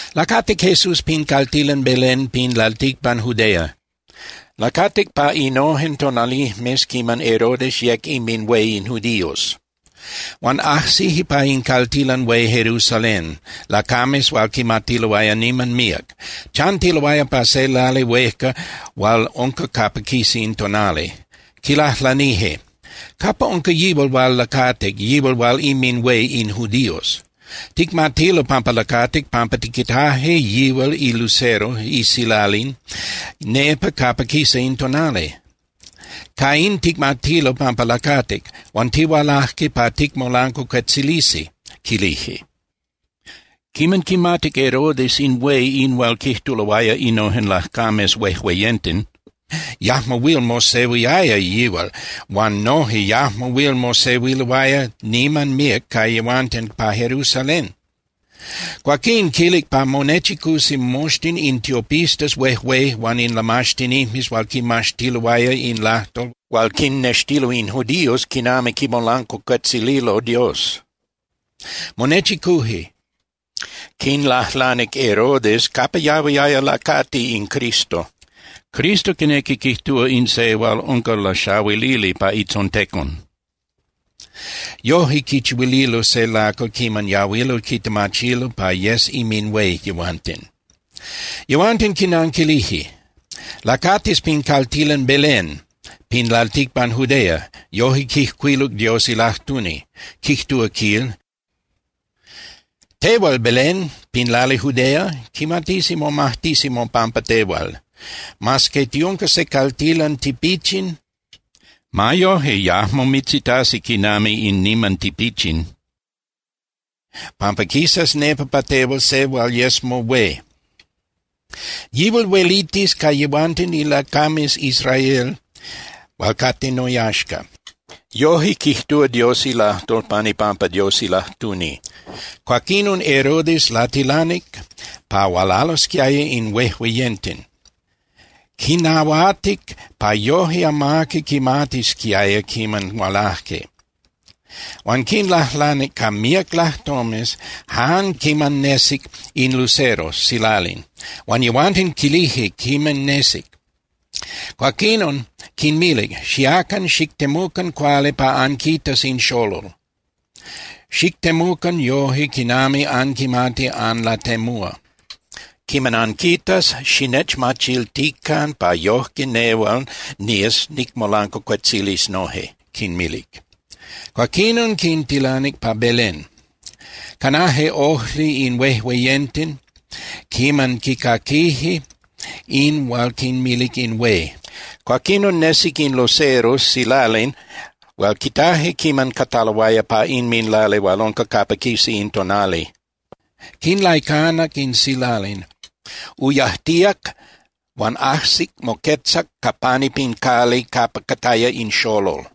Lacatic Jesús pin caltilan Belén pin lalticpan Judea. Lacatic pa innojen tonalijmes quiman Herodes yec inminhué in judíos. Huan ajsije pa in caltilan hué Jerusalén lacames hual quimatiloaya niman míac. Chantiloaya pa se lali huejca hual unca capa quisa in tonali. Quilajlanije: —¿Capa unca yihual hual lacatic, yihual hual inminhué in judíos? Ticmatilo pampa lacatic, pampa tiquitaje yihual ilucero (isilalin) nepa capa quisa in tonali. Ca in ticmatilo pampa lacatic, huan tihualaje pa ticmolancuacuetzilisi —quilije. Quiman quimatic Herodes in hué in hual quijtuloaya innojen lacames huejueyenten, yajmo huil mosehuiaya yihual huan noje yajmo huil mosehuiloaya niman míac ca yehuanten pa Jerusalén. Cuaquín quilic pa monechicusi moxtin in tiopistas huejué huan in lamaxtinijmes hual quimaxtiloaya in lajtol hual quinnextilo in judíos quinami quimolancuacuetzililo Dios. Monechicuje, quinlajlanic Herodes capa yahuiaya lacati in Cristo. (Cristo quinequi quijtúa in se hual unca laxahuilili pa itzontecon. Yoje quichihuililo se lacal quiman yahuilo quitemachilo pa yes inminhué yehuanten.) Yehuanten quinanquilije: —Lacatis pin caltilan Belén pin lalticpan Judea, yoje quijcuiluc Dios ilajtuni. Quijtúa, quil: Tehual, Belén, pin lali Judea, quimatisi momajtisi mopampa tehual. Mas que tiunca se caltilan tipichin, ma yoje yajmo mitzitasi quinami in niman tipichin, pampa quisas nepa pa tehual se hual yes mohué. Yihual huelitis ca yehuanten ilacames Israel hual cate noyaxca. Yoje quijtúa Dios ilajtol pan ipampa Dios ilajtuni. Cuaquinon Herodes latilanic pa hualalosquiaya in huéjueyenten, quinnahuatic pa yoje amaqui quimatisquiaya quiman hualaje. Huan quinlajlanic ca míac lajtomes jan quiman nesic in lucero (silalin), huan yehuanten quilije quiman nesic. Cuaquinon quinmilic: —Xiacan, xictemucan cuali pa anquitas in xolol. Xictemucan yoje quinami anquimati anlatemúa. Quiman anquitas, xinechmachiltican pa yojque nehual nías nicmolancuacuetzilis noje —quinmilic. Cuaquinon quintilanic pa Belén. Canaje ojli in huéjueyenten quiman quicaquije in hual quinmilic in hué. Cuaquinon nesic in lucero (silalin) hual quitaje quiman cataloaya pa inminlali hual unca capa quisa in tonali. Quinlaicanac in silalin, uyajtíac huan ajsic moquetzac ca pani pin cali capa cataya in xolol.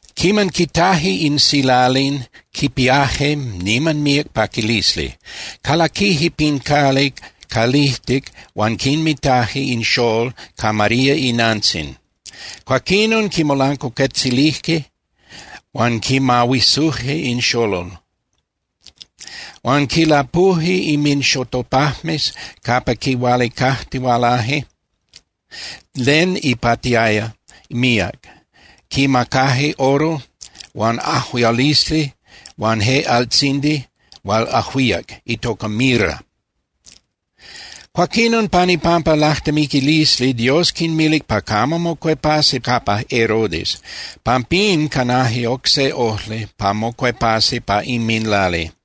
Quiman quitaje in silalin, quipiaje niman míac paquilisli. Calaquije pin cali calijtic huan quinmitaje in xolol ca María inantzin. Cuaquinon quimolancuacuetzilije huan quimahuisuje in xolol. Huan quilapuje inminxotopajmes capa quihualicatihualaje len ipatiaya míac. Quimacaje oro huan ajuialisli huan je altzindi hual ajuíac, itoca mirra. Cuaquinon pan ipampa lajtemiquilisli Dios quinmilic pa camo mocuepasi capa Herodes. Pampín canaje oc se ojli pa mocuepasi pa inminlali.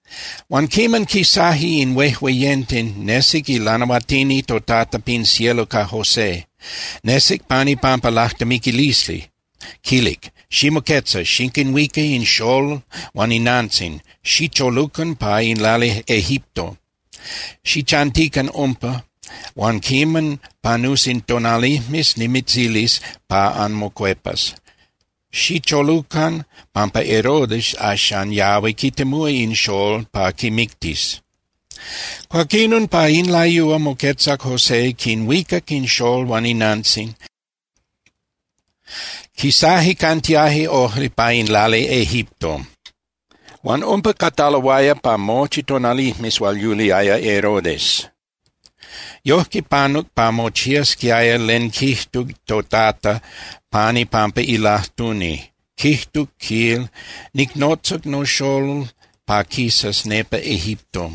Huan quiman quisaje in huejueyenten, nesic ilanahuatini toTata pin cielo ca José. Nesic pan ipampa lajtemiquilisli, quilic: —Ximoquetza, xiquinhuica in xolol huan inantzin, xicholucan pa in lali Egipto. Xichantican umpa huan quiman panusi tonalijmes nimitzilis pa anmocuepas. Xicholucan, pampa Herodes axan yahui quitemúa in xolol pa quimictis. Cuaquinon pa in layúa moquetzac José, quinhuicac in xolol huan inantzin, quisaje cantiaje ojli pa in lali Egipto. Huan umpa cataloaya pa mochi tonalijmes hual yuliaya Herodes. Yojque panuc pa mochiasquiaya len quijtuc toTata pan ipampa ilajtuni. Quijtuc, quil: “Nicnotzac noxolol pa quisas nepa Egipto.”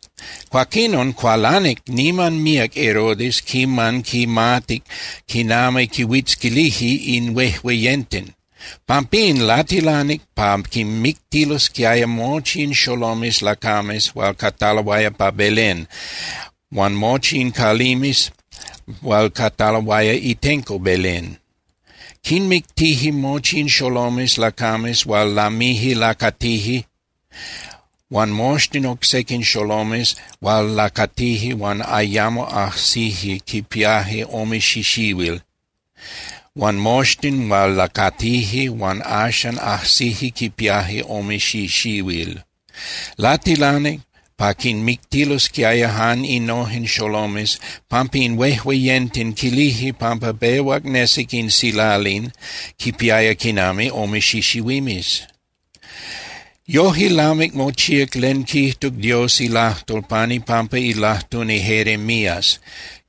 Cuaquinon, cualanic niman míac Herodes quiman quimatic quinami quihuitzquilije in huejueyenten. Pampín latilanic pa quinmictilosquiaya mochi in xolomes lacames hual cataloaya pa Belén huan mochi in calimes hual cataloaya itenco Belén. Quinmictije mochi in xolomes lacames hual lamije lacatije huan moxtin oc sequin xolomes hual lacatije huan ayamo ajsije quipiaje ome xixihuil huan moxtin hual lacatije huan axan ajsije quipiaje ome xixihuil. Latilanic pa quinmictilosquiaya jan innojen xolomes, pampa in huejueyenten quilije pampa pehuac nesic in silalin quipiaya quinami ome xixihuimes. Yoje lamic mochíac len quijtuc Dios ilajtol pan ipampa ilajtuni Jeremías,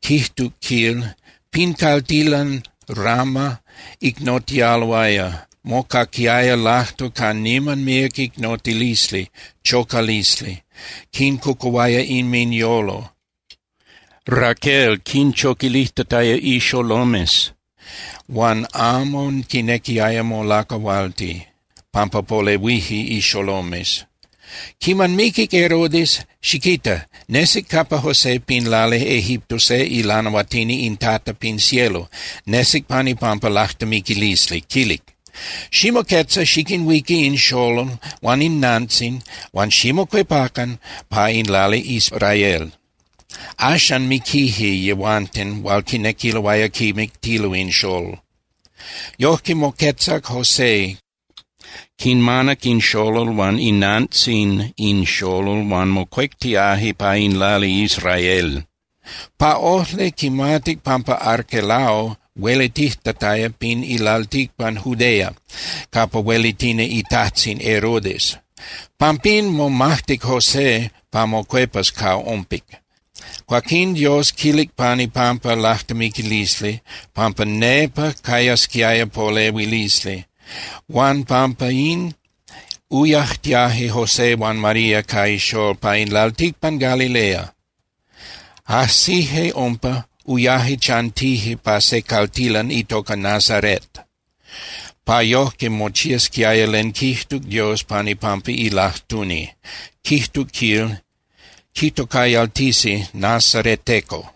quijtuc, quil: Pin caltilan Rama icnotialoaya. Mocaquiaya lajtol ca niman míac icnotilisli, chocalisli, quincocuhuaya inminyolo, Raquél quinchoquilijtataya ixolomes, huan amo quinequiaya molacahualti, pampa polehuije ixolomes. Quiman miquic Herodes, xiquita, nesic capa José pin lali Egipto se ilanahuatini in Tata pin cielo. Nesic pan ipampa lajtemiquilisli, quilic: —Ximoquetza, xiquinhuica in xolol huan inantzin huan ximocuepacan pa in lali Israel. Axan miquije yehuanten hual quinequiloaya quimictilo in xolol. Yojque, moquetzac José, quinmanac in xolol huan inantzin in xolol huan mocuectiaje pa in lali Israel. Pa ojli, quimatic pampa Arquelao huelitijtataya pin lalticpan Judea capa huelitini itajtzin Herodes. Pampín momajtic José pa mocuepas ca umpic. Cuaquín Dios quilic pan ipampa lajtemiquilisli pampa nepa cayasquiaya polehuilisli, huan pampín uyajtiaje José huan María ca ixolol pa in lalticpan Galilea. Ajsije umpa, uyaje chantije pa se caltilan itoca Nazaret, pa yojque mochiasquiaya len quijtuc Dios pan ipampa ilajtuni. Quijtuc, quil: “Quitocayaltisi nazareteco.”